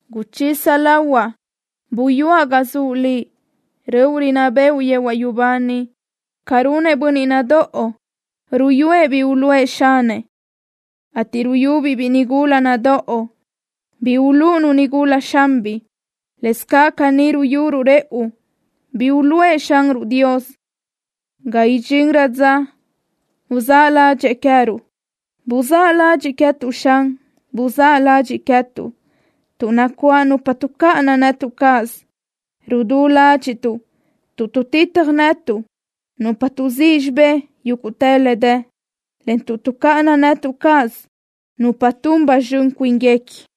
Uchisa lahuaʼ uyúaʼ ga zuʼ Liʼ, röʼu rinná bëʼu yehuaʼ yubá niʼ. Ca runëʼ bönniʼ nadóʼo, ruyúëʼ bi uluʼë xanëʼ, ateʼ ruyubiʼ biʼi nigula nadóʼo bi ulúʼunu nigula xanbiʼ, lëscaʼ caní ruyuruʼ rëʼu bi uluʼë Xanruʼ Dios, ga idxinrö dza uzáʼ ládxëʼë queë́ruʼ. Buzáʼ ladxiʼ queë́tuʼ, Xan. Buzáʼ ladxiʼ queë́tuʼ, tuʼ nacuáʼ nupa tuʼcáʼana netuʼ cáʼasö. Rudú ládxiʼtuʼ tuʼ tuʼtitaj netuʼ nupa tuʼzíʼ xibé yúguʼtë le dë, en tuʼ tuʼcáʼana netuʼ cáʼasö nupa tun ba zxön cuínguequi.